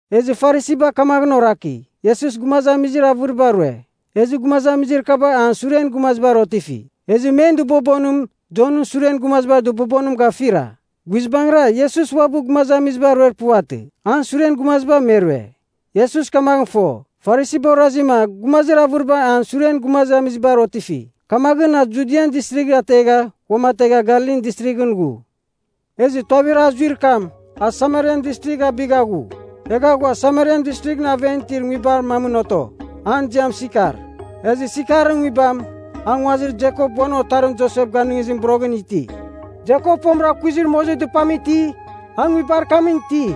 Ezɨ Farisiba kamaghɨn oraki, Iesus gumazamizir avɨriba rue ezɨ gumazamizir kaba an suren gumazibar otifi. Ezɨ men dɨbobonim Jonɨn suren gumazibar dɨbobonim gafira. (Guizbangɨra, Iesus uabɨ gumazamiziba ruer puvatɨ. An suren gumaziba me rue.) Iesus kamaghɨn fo, Farisiba orazima gumazir avɨriba an suren gumazamizibar otifi, kamaghɨn a Judian Distrigh ategha uamategha Galilin Distrighɨn ghu. Ezɨ tuavir a zuir kam, a Samarian Distrigh abigha ghu. Egha a ghua Samarian Distrighɨn aven itir nguibar mamɨn oto, an ziam Sikar. Ezɨ Sikarɨn nguibam, a nguazir Jekop uan otarim Josep ganɨngizimɨn boroghɨra iti. Jekop fomɨra kuizir mozir dɨpam iti, a nguibar kamɨn ti.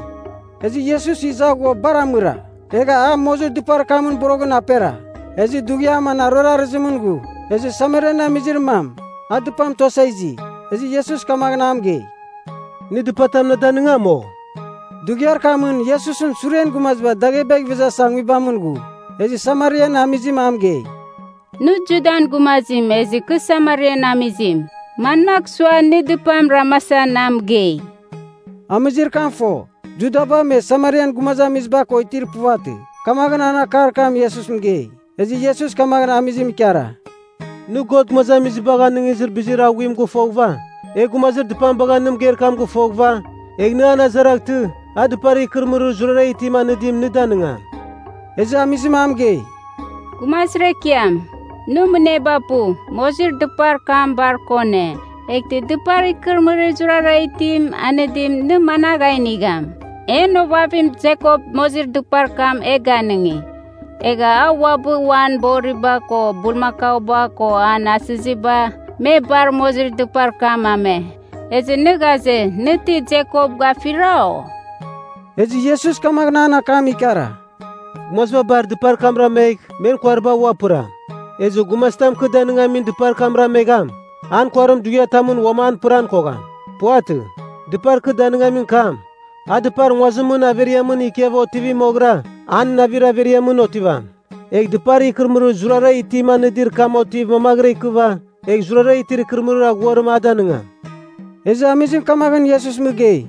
Ezɨ Iesus iza ghua bar amɨra. Egha a mozir dɨpar kamɨn boroghɨn apera. Ezɨ dughiam an aruer arɨzimɨn ghu. Ezɨ Samarian amizir mam, a dɨpam tuasa izi, ezɨ Iesus kamaghɨn a mɨgei, “Nɨ dɨpatam na danɨngam, o?” (Dughiar kamɨn Iesusɨn suren gumaziba daghebagh ivezasa nguibamɨn ghu.) Ezɨ Samarian amizim a mɨgei, “Nɨ Judan gumazim ezɨ kɨ Samarian amizim. Manmagh sua, nɨ dɨpam ramasa na mɨgei?” (Amizir kam fo, Judaba me Samarian gumazamiziba ko itir puvatɨ, kamaghɨn an akar kam Iesus mɨgei.) Ezɨ Iesus kamaghɨn amizim ikara, “Nɨ, God gumazamizibagh anɨngizir bizir aghuim gɨfoghɨva, egh gumazir dɨpam bagha nɨ mɨgeir kam gɨfoghɨva, egh nɨ an azaraghtɨ, a dɨpar ikɨrɨmɨrir zurara itim anɨdim nɨ danigam.” Ezɨ amizim a mɨgei, “Gumazir ekiam, nɨ mɨneba pu. Mozir dɨpar kam bar kone. Eghtɨ dɨpar ikɨrɨmɨrir zurara itim anɨdim, nɨ managh a inigham? En ovavim Jekop mozir dɨpar kam e ganɨngi. Egha a uabɨ uan boriba ko bulmakauba ko an asɨziba, me bar mozir dɨpar kam ame. Ezɨ nɨ ghaze, nɨ ti Jekop gafira, o?” Ezɨ Iesus kamaghɨn an akam ikara, “Gumaziba bar dɨpar kam ramegh, men kuariba ua pɨram. Ezɨ gumazitam kɨ danɨngamin dɨpar kam ramegham, an kuarim dughiatamɨn uam an pɨran kogham. Puvatɨ. Dɨpar kɨ danɨngamin kam, a dɨpar nguazimɨn averiamɨn ikiava otivi moghɨra, an navir averiamɨn otivam. Egh dɨpar ikɨrɨmɨrir zurara itim anɨdir kam otiv mamaghɨra ikɨva, egh zurara itir ikɨrɨmɨrir aghuarim a danɨngam.” Ezɨ amizim kamaghɨn Iesus mɨgei,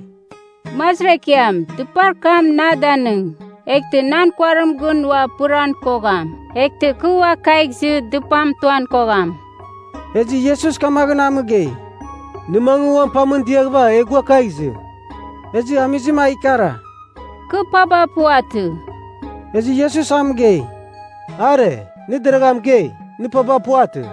“Gumazir ekiam, dɨpar kam na danɨng. Eghtɨ nan kuarim gɨn ua pɨran kogham, eghtɨ kɨ ua kagh izɨ dɨpam tuan kogham.” Ezɨ Iesus kamaghɨn a mɨgei, “Nɨ mangɨ uan pamɨn diaghɨva egh gua kagh izɨ.” Ezɨ amizim a ikara, “Kɨ paba puvatɨ.” Ezɨ Iesus a mɨgei, “Are, nɨ deragha mɨgei, nɨ paba puvatɨ.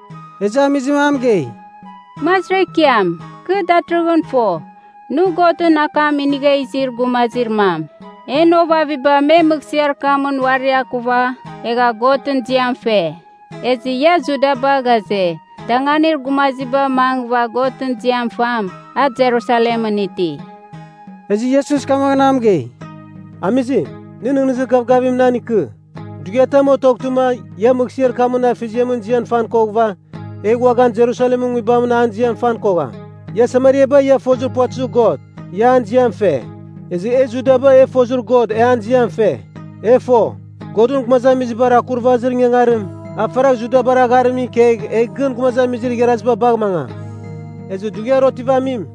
Ezɨ amizim a mɨgei, “Gumazir Ekiam, kɨ datɨrɨghɨn fo, nɨ Godɨn akam inigha izir gumazir mam. En ovaviba me mɨghsɨar kamɨn uari akuva, egha Godɨn ziam fe. Ezɨ ia Judaba ghaze, danganir gumaziba mangɨva Godɨn ziam fam, a Jerusalemɨn iti.” Ezɨ Iesus kamaghɨn a mɨgei, “Amizim, nɨ nɨghnɨzir gavgavim nan ikɨ. Dughiatam otoghtɨma ia mɨghsɨar kamɨn Afeziamɨn ziam fan koghɨva, egh uaghan Jerusalemɨn nguibamɨn an ziam fan kogham. Ia Samariaba ia fozir puvatɨzir God, ia an ziam fe. Ezɨ e Judaba e fozir God, e an ziam fe. E fo, Godɨn gumazamizibar akurvazir ingangarim, a faragh Judabar agharimɨn ikegh egh gɨn gumazamizir igharaziba bagh mangam. Ezɨ dughiar otivamim,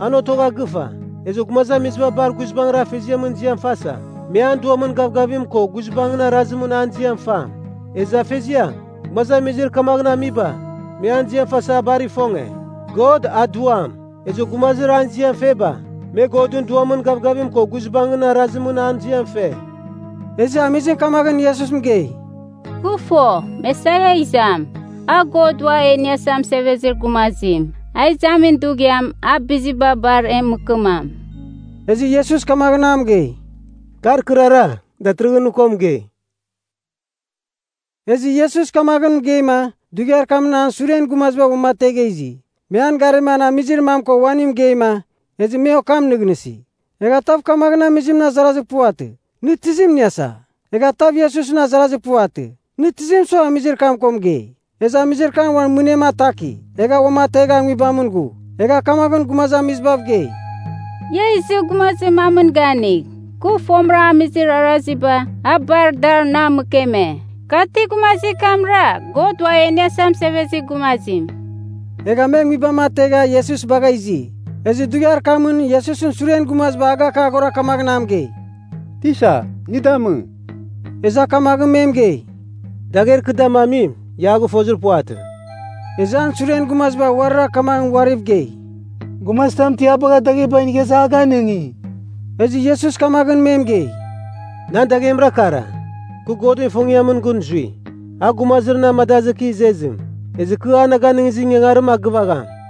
an otogha gɨfa, ezɨ gumazamiziba bar guizbangɨra Afeziamɨn ziam fasa, me an Duamɨn gavgavim ko guizbangɨn arazimɨn an ziam fam. Ezɨ Afeziam, gumazamizir kamaghɨn amiba, me an ziam fasa a bar ifonge. God, a Duam. Ezɨ gumazir an ziam feba, me Godɨn Duamɨn gavgavim ko guizbangɨn arazimɨn an ziam fe.” Ezɨ amizim kamaghɨn Iesus mɨgei, “Kɨ fo, Mesaia a izam (a God Ua E Iniasa Mɨsevezir Gumazim.) A izamin dughiam, a biziba bar e mɨkɨmam.” Ezɨ Iesus kamaghɨn a mɨgei, “Kar kɨrara, datɨrɨghɨn nɨ ko mɨgei.” Ezɨ Iesus kamaghɨn mɨgeima, dughiar kamɨn an suren gumaziba uamategha izi. Me an garima an amizir mam ko uaning mɨgeima, ezɨ me okam nɨghnɨsi. Egha tav kamaghɨn amizimɨn azarazir puvatɨ, “Nɨ tizim iniasa?” Egha tav Iesusɨn azarazir puvatɨ, “Nɨ tizim sua amizir kam ko mɨgei?” Ezɨ amizir kam uan mɨnem ataki, egha uamategha nguibamɨn ghu. Egha kamaghɨn gumazamizibav gei, “Ia izɨ gumazir mamɨn ganigh. Kɨ fomɨra amizir araziba, a bar dar na mɨkeme. Ka ti gumazir kamra, God Ua E Iniasa Mɨsevezir Gumazim?” Egha me nguibam ategha, Iesus bagha izi. Ezɨ dughiar kamɨn, Iesusɨn suren gumaziba agakaghora kamaghɨn a mɨgei, “Tisa, nɨ damɨ.” Ezɨ a kamaghɨn me mɨgei, “Dagher kɨ damamim, ia a gɨfozir puvatɨ.” Ezɨ an suren gumaziba uarira kamaghɨn uariv gei, “Gumazitam ti a bagha dagheba inigha iza a ganɨngi?” Ezɨ Iesus kamaghɨn me mɨgei, “Nan daghemra kara, kɨ Godɨn ifongiamɨn gɨn zui, a gumazir na amadazɨ kɨ izezim. Ezɨ kɨ a na ganɨngizir ingangarim, a gɨvagham.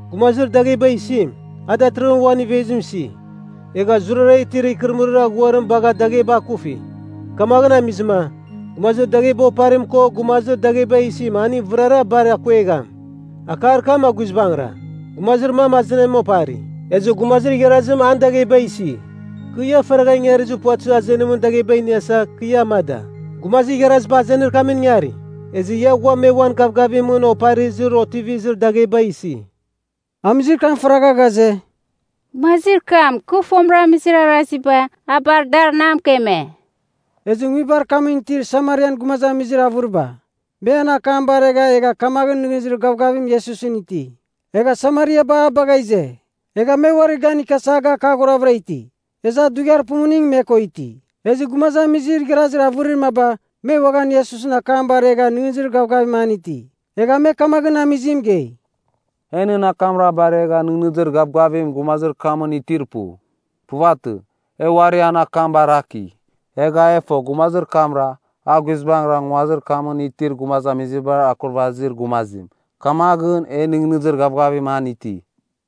Gumazir dagheba isim, a datɨrɨghɨn uan ivezim isi, egha zurara itir ikɨrɨmɨrir aghuarim bagha dagheba akufi. Kamaghɨn amizɨma, gumazir dagheba oparim ko gumazir dagheba isim aning vɨrara bar akuegham. Akar kam a guizbangɨra, ‘Gumazir mam azenim opari, ezɨ gumazir igharazim an dagheba isi.’ Kɨ, ia faragha ingarizir puvatɨzir azenimɨn dagheba iniasa, kɨ ia amada. Gumazir igharaziba azenir kamɨn ingari, ezɨ ia ghua me uan gavgavimɨn oparizir otivizir dagheba isi.” Amizir kam faragha ghaze, “Gumazir kam, kɨ fomɨra amizir araziba, a bar dar na mɨkeme.” Ezɨ nguibar kamɨn itir Samarian gumazamizir avɨriba, me an akam baregha egha kamaghɨn nɨghnɨzir gavgavim Iesusɨn iti. Egha Samariaba a bagha ize, egha me uarir gan ikiasa agakaghoravɨra iti. Ezɨ a dughiar pumuningɨn me ko iti. Ezɨ gumazamizir igharazir avɨrir maba, me uaghan Iesusɨn akam baregha nɨghnɨzir gavgavim an iti. Egha me kamaghɨn amizim mɨgei, “E nɨn akamra baregha nɨghnɨzir gavgavim gumazir kamɨn itir pu. Puvatɨ. E uari an akam baraki, egha e fo, gumazir kamra, a guizbangɨra nguazir kamɨn itir gumazamizibar Akurvazir Gumazim. Kamaghɨn e nɨghnɨzir gavgavim an iti.”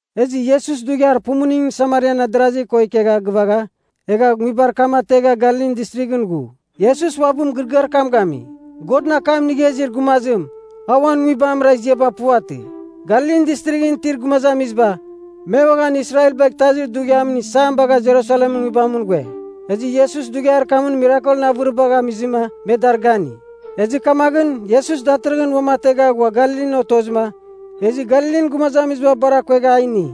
Ezɨ Iesus dughiar pumuningɨn Samarian adarazi ko ikegha gɨvagha, egha nguibar kam ategha Galilin Distrighɨn ghu. Iesus uabɨ mɨgɨrɨgɨar kam gami, “Godɨn akam inigha izir gumazim, a uan nguibamra ziaba puvatɨ.” Galilin Distrighɨn itir gumazamiziba, me uaghan Israel bagh Itazir Dughiamɨn Isam bagha Jerusalemɨn nguibamɨn ghue, ezɨ Iesus dughiar kamɨn mirakelɨn avɨribagh amizɨma me dar gani. Ezɨ kamaghɨn Iesus datɨrɨghɨn uamategha ghua Galilin otozɨma, ezɨ Galilin gumazamiziba bar akuegha a ini.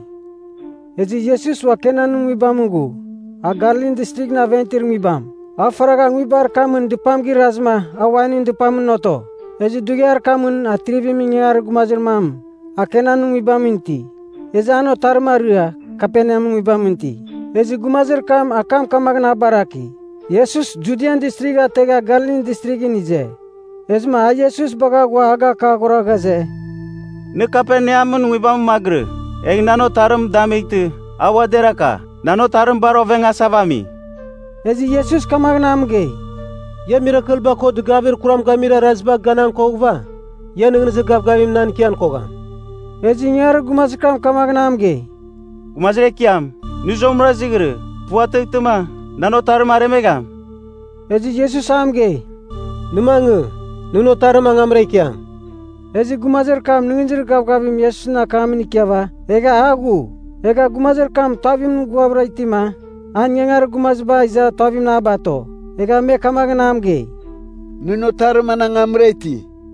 Ezɨ Iesus ua Kanan nguibamɨn ghu, a Galilin Distrighɨn aven itir nguibam. A faragha nguibar kamɨn dɨpam girazɨma a wainɨn dɨpamɨn oto. Ezɨ dughiar kamɨn atrivimɨn ingangarir gumazir mam, a Kanan nguibamɨn iti. Ezɨ an otarim arɨa, Kaperneamɨn nguibamɨn iti. Ezɨ gumazir kam akam kamaghɨn a baraki, Iesus Judian Distrigh ategha Galilin Distrighɨn ize. Ezɨma a Iesus bagha ghua agakaghora ghaze, “Nɨ Kaperneamɨn nguibamɨn magɨrɨ, egh nan otarim damightɨ, a ua deraka. Nan otarim bar ovengasava ami.” Ezɨ Iesus kamaghɨn a mɨgei, “Ia mirakelba ko dɨgavir kuram gamir arazibar ganan koghɨva, ia nɨghnɨzir gavgavim nan ikian kogham.” Ezɨ ingangarir gumazir kam kamaghɨn a mɨgei, “Gumazir Ekiam, nɨ zuamɨra izighirɨ. puvatɨghtɨma, nan otarim aremegham.” Ezɨ Iesus a mɨgei, “Nɨ mangɨ, nɨn otarim angamra ikiam.” Ezɨ gumazir kam nɨghnɨzir gavgavim Iesusɨn akamɨn ikiava, egha a ghu. Egha gumazir kam tuavimɨn ghuavɨra itima, an ingangarir gumaziba iza tuavimɨn a bato, egha me kamaghɨn a mɨgei, “Nɨn otarim an angamra iti!”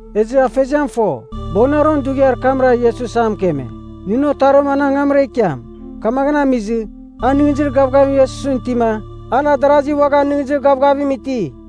Ezɨ afeziam fo, boghɨnaron dughiar kamra Iesus a mɨkeme, “Nɨn otarim an angamra ikiam.” Kamaghɨn amizɨ, a nɨghnɨzir gavgavim Iesusɨn itima, an adarazi uaghan nɨghnɨzir gavgavim iti.